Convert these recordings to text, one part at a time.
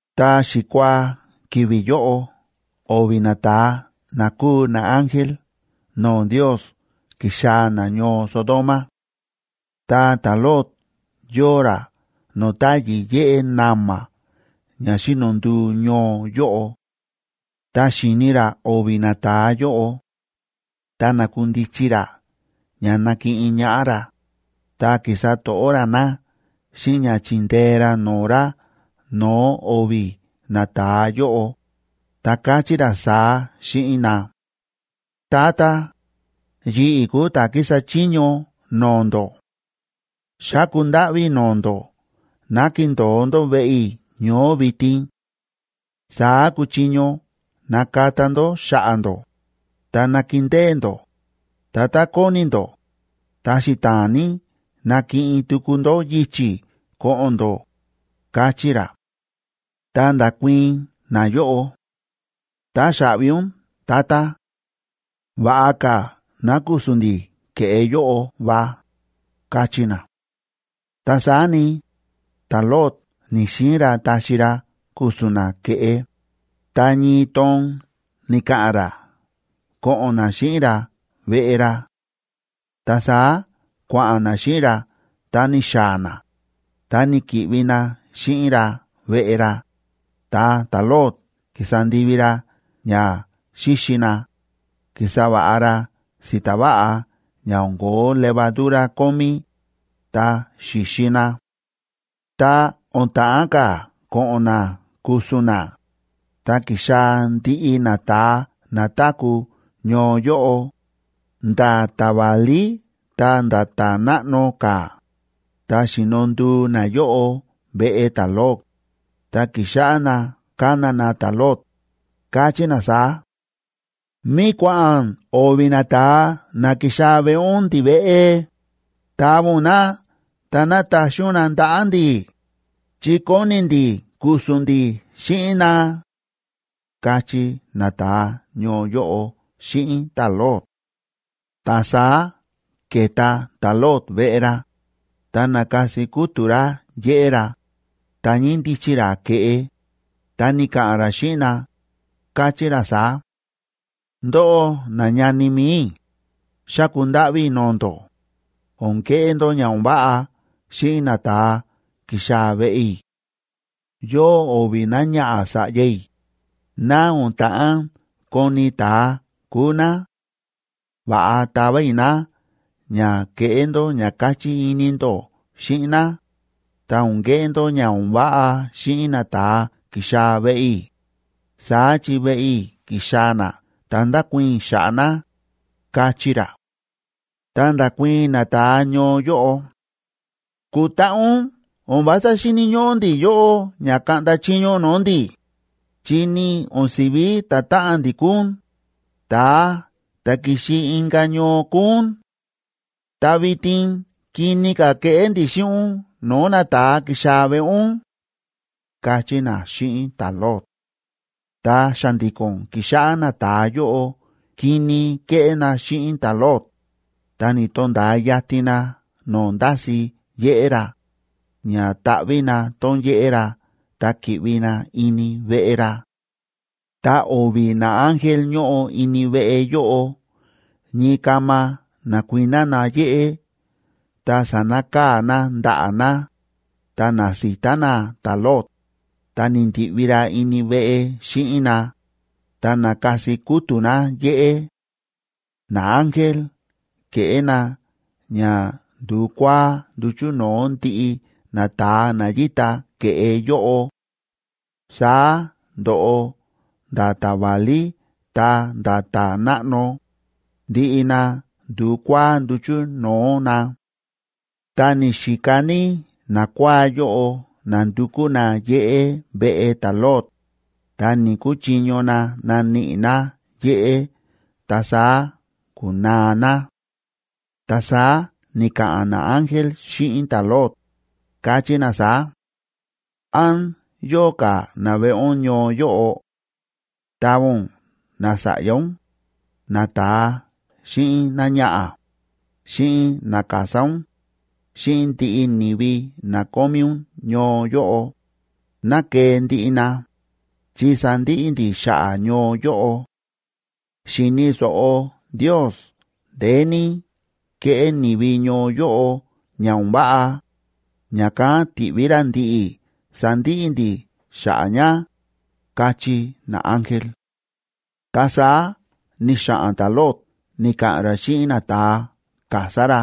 Ta xikuaa ki̱vi̱ yóꞌo o̱vi̱ nata̱a na kúu naángel no̱o̱ Ndios ki̱xaa̱ na ñoo Sodoma. Ta ta̱Lot yóo ra no̱o̱ táyi̱ yéꞌé na̱ma̱ ña xíno nduu ñoo yóꞌo. Ta xi̱ni ra o̱vi̱ nata̱a yóꞌo, ta na̱kundichi ra ña nakiꞌin ñaꞌá ra, ta ki̱sa to̱ꞌó ra na xíꞌin ña chi̱ndee ra no̱o̱ ra no̱o̱ o̱vi̱ nata̱a yóꞌo, ta káchí ra saá xíꞌin na: ―Tata, yi̱ꞌi̱ kúu ta̱ kísa chiño no̱o̱ ndó. Xáku ndáꞌví i̱ no̱o̱ ndó ná kindo̱o ndó veꞌe i̱ ñoó vitin. Saá kuchiño nakata ndó xa̱ꞌa̱ ndó, ta nakindée ndó, ta tá kóni ndó, ta xita̱a̱n ní nakiꞌin tuku ndó yichi̱ ko̱ꞌo̱n ndó ―káchí ra. Ta nda̱kuii̱n nayóꞌo: ―Táxaꞌvi ún, tata. Va̱ꞌa ka̱ ná ku̱su̱n ndi̱ ke̱ꞌe yóꞌo va ―káchí na. Ta saá ni, ta̱Lot ni̱‑xiin ra taxi ra ku̱su̱n na ke̱ꞌe, ta ñii toon ni̱ka̱ꞌa̱n ra ko̱ꞌo̱n na xíꞌin ra veꞌe ra. Ta saá kua̱ꞌa̱n na xíꞌin ra ta ni̱xaa̱ na, ta ni̱ki̱ꞌvi na xíꞌin ra veꞌe ra, ta ta̱Lot ki̱sa ndivi ra ña xíxi na, ki̱sa va̱ꞌa ra si̱ta̱ va̱ꞌa ña o̱n ko̱ó levadura kómí, ta xi̱xi na. Ta o̱n ta̱ꞌán ka̱ ko̱ꞌo̱n na ku̱su̱n na, ta ki̱xaa̱ ndiꞌi nata̱a na táku̱ ñoo yóꞌo, nda̱ ta̱ válí ta̱nda̱ ta̱ náꞌno ka̱, ta xi̱no nduu nayóꞌo veꞌe ta̱Lot, ta ki̱xáꞌá na kána na ta̱Lot, káchí na saá: ―¿Mí kua̱ꞌa̱n o̱vi̱ nata̱a na ki̱xaa̱ veꞌe ún ndiveꞌe? ¡Tava ún na ta ná taxi ún na ndaꞌa̱ ndi̱, chi kóni ndi̱ ku̱su̱n ndi̱ xíꞌin na! ―káchí nata̱a ñoo yóꞌo xíꞌin ta̱Lot. Ta saá ke̱ta ta̱Lot veꞌe ra, ta na̱kasi kútu̱ ra yéꞌé ra, ta ñíndichi ra ke̱ꞌe, ta ni̱ka̱ꞌa̱n ra xíꞌin na, káchí ra saá: ―Ndóꞌó nañani mi̱i i̱, xáku ndáꞌví i̱ no̱o̱ ndó, o̱n keꞌé ndó ña o̱n váꞌa xíꞌin nata̱a ki̱xaa̱ veꞌe i̱. Yóo o̱vi̱ náñaꞌa̱ sa̱ꞌya i̱, ná o̱n ta̱ꞌán koni̱ ta̱a kúu ná; va̱ꞌa tava i̱ ná ña keꞌé ndó ña káchí ini ndó xíꞌin ná, ta o̱n keꞌé ndó ña o̱n váꞌa xíꞌin nata̱a ki̱xaa̱ veꞌe i̱, saá chi veꞌe i̱ ki̱xaa̱ na ta ndákuii̱n i̱ xa̱ꞌa̱ na ―káchí ra. Ta nda̱kuii̱n nata̱a ñoo yóꞌo: ―¡Kutaꞌa ún! O̱n vása xíni̱ ñóꞌó ndi̱ yóꞌó ña kaꞌnda chiño ún no̱o̱ ndi̱, chi ni o̱n si̱ví ta̱táꞌan ndi̱ kúu ún, ta̱a ta̱ ki̱xi inka̱ ñoo kúu ún. ¡Ta vitin kini ka̱ keꞌé ndi̱ xíꞌin ún no̱o̱ nata̱a ki̱xaa̱ veꞌe ún! ―káchí na xíꞌin ta̱Lot. Ta xa̱ndi̱ko̱n ki̱xáꞌá nata̱a yóꞌo kini kéꞌé na xíꞌin ta̱Lot, ta ni̱to̱nda̱a yatin na no̱o̱ ndási̱ yéꞌé ra, ña taꞌví na tón yéꞌé ra ta ki̱ꞌvi na ini veꞌe ra. Ta o̱vi̱ naángel ñóꞌo ini veꞌe yóꞌo ñii kama na̱kuiná na yéꞌé ta sa̱nakaa̱ na ndaꞌa̱ na, ta na̱sita na ta̱Lot, ta ni̱ndi̱ꞌvi ra ini veꞌe xíꞌin na, ta na̱kasi kútu̱ na yéꞌé. Naángel ke̱ꞌé na ña ndu̱kuáá nduchu̱ no̱o̱ ndiꞌi nata̱a na yíta ke̱ꞌe yóꞌo; saá ndo̱ꞌo nda̱ ta̱ válí ta̱nda̱ ta̱ náꞌno, ndiꞌi na ndu̱kuáá nduchu̱ no̱o̱ na. Ta ni̱xika ní nakuáá yóꞌo nándukú na yéꞌé veꞌe ta̱Lot, ta ni̱‑kuchiño na naníꞌi na yéꞌé ta saá ku̱naa na. Ta saá ni̱ka̱ꞌa̱n naángel xíꞌin ta̱Lot, káchí na saá: ―¿Án yóo ka̱ naveꞌe ún ñoo yóꞌo? Tava ún nasa̱ꞌya ún, nata̱a xíꞌin náñaꞌa̱, xíꞌin nakasá ún, xíꞌin ndiꞌi ni̱vi na kómí ún ñoo yóꞌo, ná kee ndiꞌi na, chi sandiꞌi ndi̱ xa̱ꞌa̱ ñoo yóꞌo. Xi̱ni̱ so̱ꞌo Ndiosa ndeé ní kéꞌé ni̱vi ñoo yóꞌo ña o̱n váꞌa, ña̱kán ti̱ꞌví ra ndi̱ꞌi̱ sandiꞌi ndi̱ xa̱ꞌa̱ ña ―káchí naángel. Ta saá ni̱xa̱ꞌa̱n ta̱Lot ni̱ka̱ꞌa̱n ra xíꞌin nata̱a kasá ra,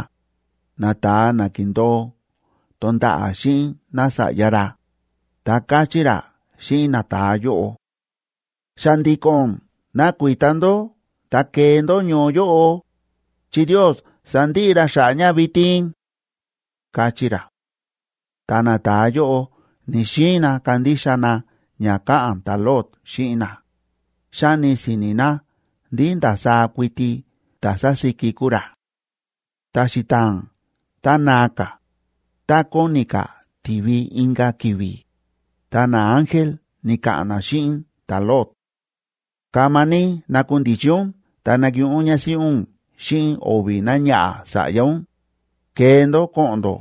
nata̱a na ki̱ndo̱o tonda̱ꞌa̱ xíꞌin nása̱ꞌya ra, ta káchí ra xíꞌin nata̱a yóꞌo: ―¡Xa̱ndi̱ko̱n nakuita ndó ta kee ndó ñoo yóꞌo, chi Ndios sandiꞌi ra xa̱ꞌa̱ ña vitin! ―káchí ra. Ta nata̱a yóꞌo ni̱‑xiin na kandixa na ña káꞌa̱n ta̱Lot xíꞌin na, xáni si̱ni̱ na ndí ndasaá kuiti ta̱ sásíki kúu ra. Ta xita̱a̱n ta naa ka̱, ta kóni ka̱ ti̱vi inka̱ ki̱vi̱, ta naángel ni̱ka̱ꞌa̱n na xíꞌin ta̱Lot: ―Kama ní nakundichi ún ta nakiꞌin ún ñásíꞌí ún xíꞌin o̱vi̱ náñaꞌa̱ sa̱ꞌya ún, kee ndó ko̱ꞌo̱n ndó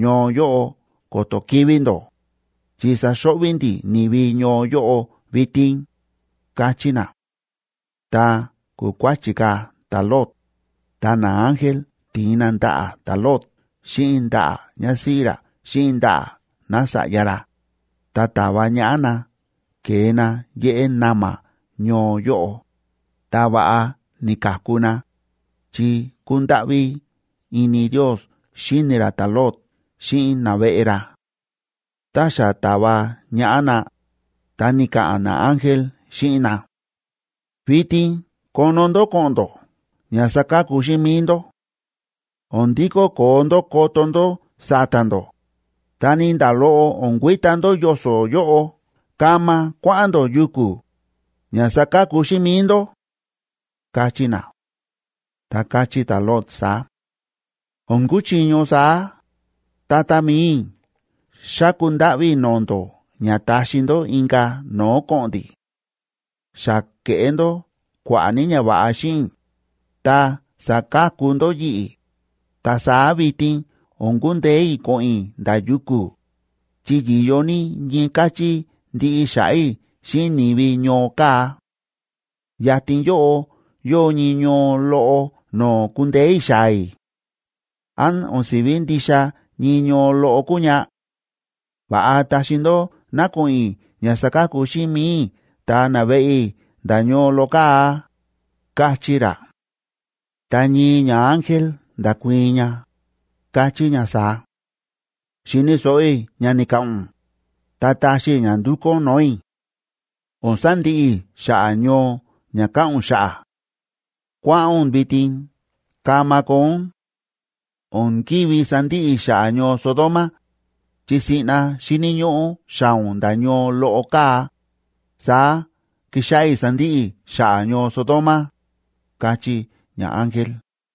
ñoo yóꞌo ko̱to̱ kivi̱ ndó, chi saxo̱ꞌvi̱ ndi̱ ni̱vi ñoo yóꞌo vitin ―káchí na. Ta ku̱kuáchi̱ ka̱ ta̱Lot, ta naángel ti̱in na ndaꞌa̱ ta̱Lot xíꞌin ndaꞌa̱ ñásíꞌí ra xíꞌin ndaꞌa̱ nása̱ꞌya ra, ta ta̱va ñaꞌá na ke̱e na yéꞌé na̱ma̱ ñoo yóꞌo, ta va̱ꞌa ni̱ka̱ku na, chi kúndáꞌví ini Ndios xíni ra ta̱Lot xíꞌin naveꞌe ra. Tá xa ta̱va ñaꞌá na, ta ni̱ka̱ꞌa̱n naángel xíꞌin na: ―Vitin kono ndó ko̱ꞌo̱n ndó ña saka̱ku xíꞌin mi̱i ndó. O̱n ndikó koo ndó koto ndó sa̱ta̱ ndó, ta ni nda̱ loꞌo o̱n kuita ndó yoso̱ yóꞌo. Kama kuáꞌa̱n ndó yuku̱, ña saka̱ku xíꞌin mi̱i ndó ―káchí na. Ta káchí ta̱Lot saá: ―O̱n kuchiño saá, tata mi̱i i̱, xáku ndáꞌví i̱ no̱o̱ ndó ña taxi ndó inka̱ no̱o̱ ko̱ꞌo̱n ndi̱. Xa ke̱ꞌé ndó kua̱ꞌa̱ ní ñava̱ꞌa xíꞌin i̱, ta sa̱ka̱ku ndó yi̱ꞌi̱, ta saá vitin o̱n kundeé i̱ ko̱ꞌo̱n i̱ nda̱ yuku̱, chi yi̱yo ní ñii káchí ndiꞌi xa̱ꞌa̱ i̱ xíꞌin ni̱vi ñoo kaa̱. Yatin yóꞌo yóo ñii ñoo loꞌo no̱o̱ kundeé i̱ xaa̱ i̱. ¿Án o̱n si̱ví ndixa ñii ñoo loꞌo kúu ña? Va̱ꞌa taxi ndó ná ko̱ꞌo̱n i̱ ña saka̱ku xíꞌin mi̱i i̱ ta naveꞌe i̱ nda̱ ñoo loꞌo kaa̱ ―káchí ra. Ta ñii ñaángel nda̱kuii̱n ña, káchí ña saá: ―Xi̱ni̱ so̱ꞌo i̱ ña ni̱ka̱ꞌa̱n ún, ta taxi i̱ ña ndu̱kú ún no̱o̱ i̱. O̱n sandiꞌi i̱ xa̱ꞌa̱ ñoo ña káꞌa̱n ún xa̱ꞌa̱. Kua̱ꞌa̱n ún vitin, kama koo ún; o̱n ki̱ví sandiꞌi i̱ xa̱ꞌa̱ ñoo Sodoma, chi siꞌna xíni̱ ñóꞌó xaa̱ ún nda̱ ñoo loꞌo kaa̱, saá kixáꞌá i̱ sandiꞌi i̱ xa̱ꞌa̱ ñoo Sodoma ―káchí ñaángel.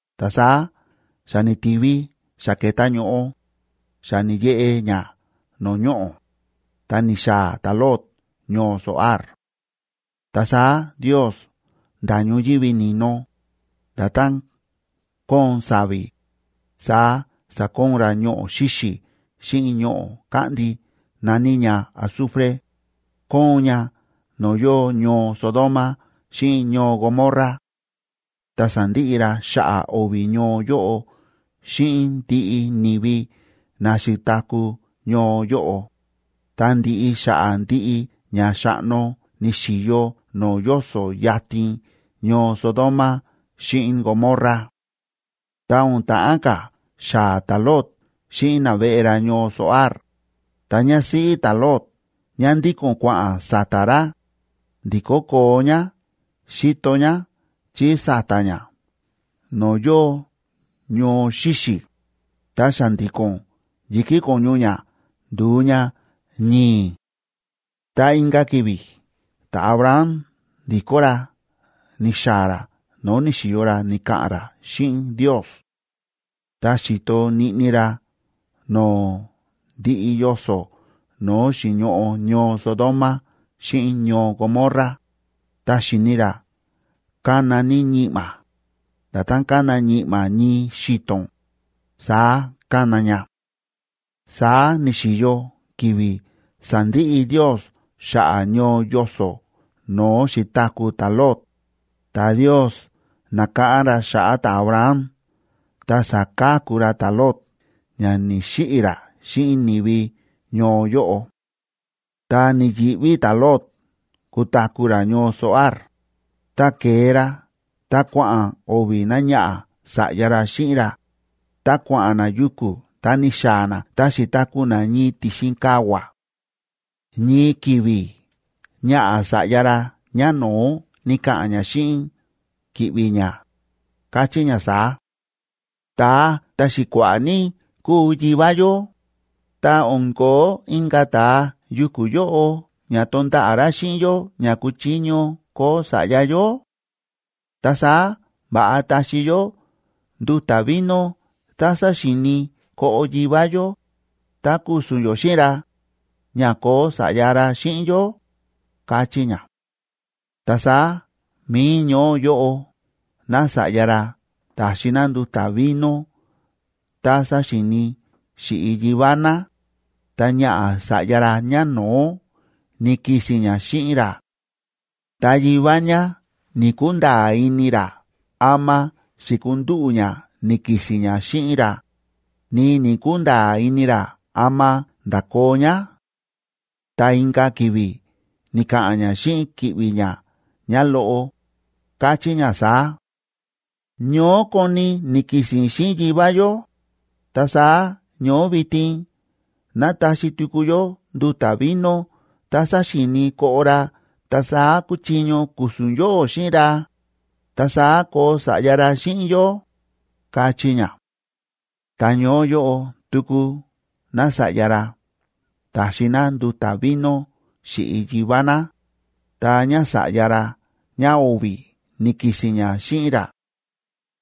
Ta saá xa ni̱ti̱vi, xa ke̱ta ño̱ꞌo, xa ni̱yeꞌe ña no̱o̱ ñoꞌo̱, ta ni̱xaa̱ ta̱Lot ñoo Zoar. Ta saá Ndios nda̱ ñoyívi ni̱no, nda̱tán kóon sa̱vi̱, saá sa̱koon ra ñoꞌo̱ xíxi̱ xíꞌin ñoꞌo̱ káꞌndi na̱ní ña azufre, kóon ña no̱o̱ yóo ñoo Sodoma xíꞌin ñoo Gomorra. Ta sa̱ndiꞌi ra xa̱ꞌa̱ o̱vi̱ ñoo yóꞌo xíꞌin ndiꞌi ni̱vi na xi̱taku̱ ñoo yóꞌo, ta ndi̱ꞌi xa̱ꞌa̱ ndiꞌi ña xa̱ꞌno ni̱xi̱yo no̱o̱ yoso̱ yatin ñoo Sodoma xíꞌin Gomorra. Ta o̱n ta̱ꞌán ka̱ xaa̱ ta̱Lot xíꞌin naveꞌe ra ñoo Zoar, ta ñásíꞌí ta̱Lot ñá ndíko̱n kua̱ꞌa̱n sa̱ta̱ ra, ndi̱kó koo ñá xi̱to ñá chí sa̱ta̱ ñá no̱o̱ yóo ñoo xíxi̱, ta xa̱ndi̱ko̱n yi̱kí ko̱ñu ñá ndu̱u ña ñi̱i̱. Ta inka̱ ki̱vi̱ ta̱Abraham ndi̱kó ra ni̱xaa̱ ra no̱o̱ ni̱xi̱yo ra ni̱ka̱ꞌa̱n ra xíꞌin Ndios; ta xi̱to niꞌni ra no̱o̱ ndiꞌi yoso̱ no̱o̱ xi̱ñoꞌo ñoo Sodoma xíꞌin ñoo Gomorra, ta xi̱ni ra kána ní ñi̱ꞌma̱, nda̱tán kána ñi̱ꞌma̱ ñii xi̱to̱n, saá kána ña. Saá ni̱xi̱yo ki̱vi̱ sa̱ndiꞌi Ndios xa̱ꞌa̱ ñoo yoso̱ no̱o̱ xi̱taku̱ ta̱Lot, ta Ndios na̱káꞌán ra xa̱ꞌa̱ ta̱Abraham ta sa̱ka̱ku ra ta̱Lot ña ni̱‑xiꞌi̱ ra xíꞌin ni̱vi ñoo yóꞌo. Ta ni̱yi̱ꞌví ta̱Lot kutaku̱ ra ñoo Zoar, ta ke̱e ra ta kua̱ꞌa̱n o̱vi̱ náñaꞌa̱ sa̱ꞌya ra xíꞌin ra, ta kua̱ꞌa̱n na yuku̱ ta ni̱xaa̱ na ta xi̱taku̱ na ñii ti̱xin kavua̱. Ñii ki̱vi̱ ñaꞌa̱ sa̱ꞌya ra ñáno̱ó ni̱ka̱ꞌa̱n ñá xíꞌin ki̱ꞌvi̱ ñá, káchí ñá saá: ―Ta̱a ta̱xi̱kua̱ꞌa̱ ní kúu yivá yó, ta o̱n ko̱ó inka̱ ta̱a yuku̱ yóꞌo ña tonda̱ꞌa̱ ra xíꞌin yó ña kuchiño koo sa̱ꞌya yó. Ta saá va̱ꞌa taxi yó nduta̱ vino tá sáxi̱i̱ni koꞌo yivá yó, ta ku̱su̱n yó xíꞌin ra, ña koo sa̱ꞌya ra xíꞌin yó ―káchí ñá. Ta saá mi̱i ñoó yóꞌo nása̱ꞌya ra ta̱xi ná nduta̱ vino tá sáxi̱i̱ni xíꞌi yivá ná, ta ñaꞌa̱ sa̱ꞌya ra ñáno̱ó ni̱ki̱si̱n ñá xíꞌin ra; ta yivá ñá ni̱‑kunda̱a̱ ini ra ama xi̱kandúꞌu̱ ñá ni̱ki̱si̱n ñá xíꞌin ra, ni ni̱‑kunda̱a̱ ini ra ama nda̱koo ñá. Ta inka̱ ki̱vi̱ ni̱ka̱ꞌa̱n ñá xíꞌin ki̱ꞌvi̱ ñá ñáloꞌo, káchí ña saá: ―Ñoó koni ni̱ki̱si̱n i̱ xíꞌin yivá yó, ta saá ñoó vitin ná taxi tuku yó nduta̱ vino tá sáxi̱i̱ni koꞌo ra ta saá kuchiño ku̱su̱n yóꞌó xíꞌin ra; ta saá koo sa̱ꞌya ra xíꞌin yó ―káchí ñá. Ta ñoó yóꞌo tuku nása̱ꞌya ra ta̱xi ná nduta̱ vino xíꞌi yivá ná, ta ñása̱ꞌya ra ñáo̱vi̱ ni̱ki̱si̱n ñá xíꞌin ra;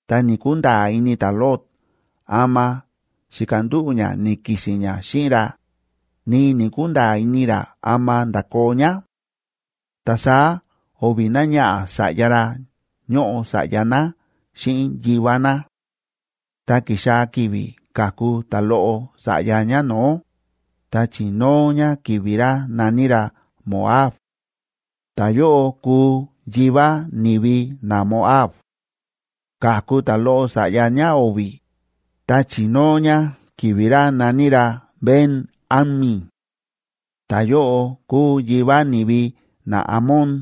ta ni̱‑kunda̱a̱ ini ta̱Lot ama xi̱kandúꞌu̱ ñá ni̱ki̱si̱n ñá xíꞌin ra, ni ni̱‑kunda̱a̱ ini ra ama nda̱koo ñá. Ta saá o̱vi̱ náñaꞌa̱ sa̱ꞌya ra ñóꞌo sa̱ꞌya ná xíꞌin yivá ná. Ta ki̱xaa̱ ki̱vi̱ ka̱ku ta̱loꞌo sa̱ꞌya ñáno̱ó, ta chi̱nóo ñá ki̱vi̱ ra na̱ní ra Moab; ta̱yóꞌo kuu yivá ni̱vi naMoab. Ka̱ku ta̱loꞌo sa̱ꞌya ñáo̱vi̱, ta chi̱nóo ñá ki̱vi̱ ra na̱ní ra Ben‑ammi; ta̱yóꞌo kuu yivá ni̱vi naAmon.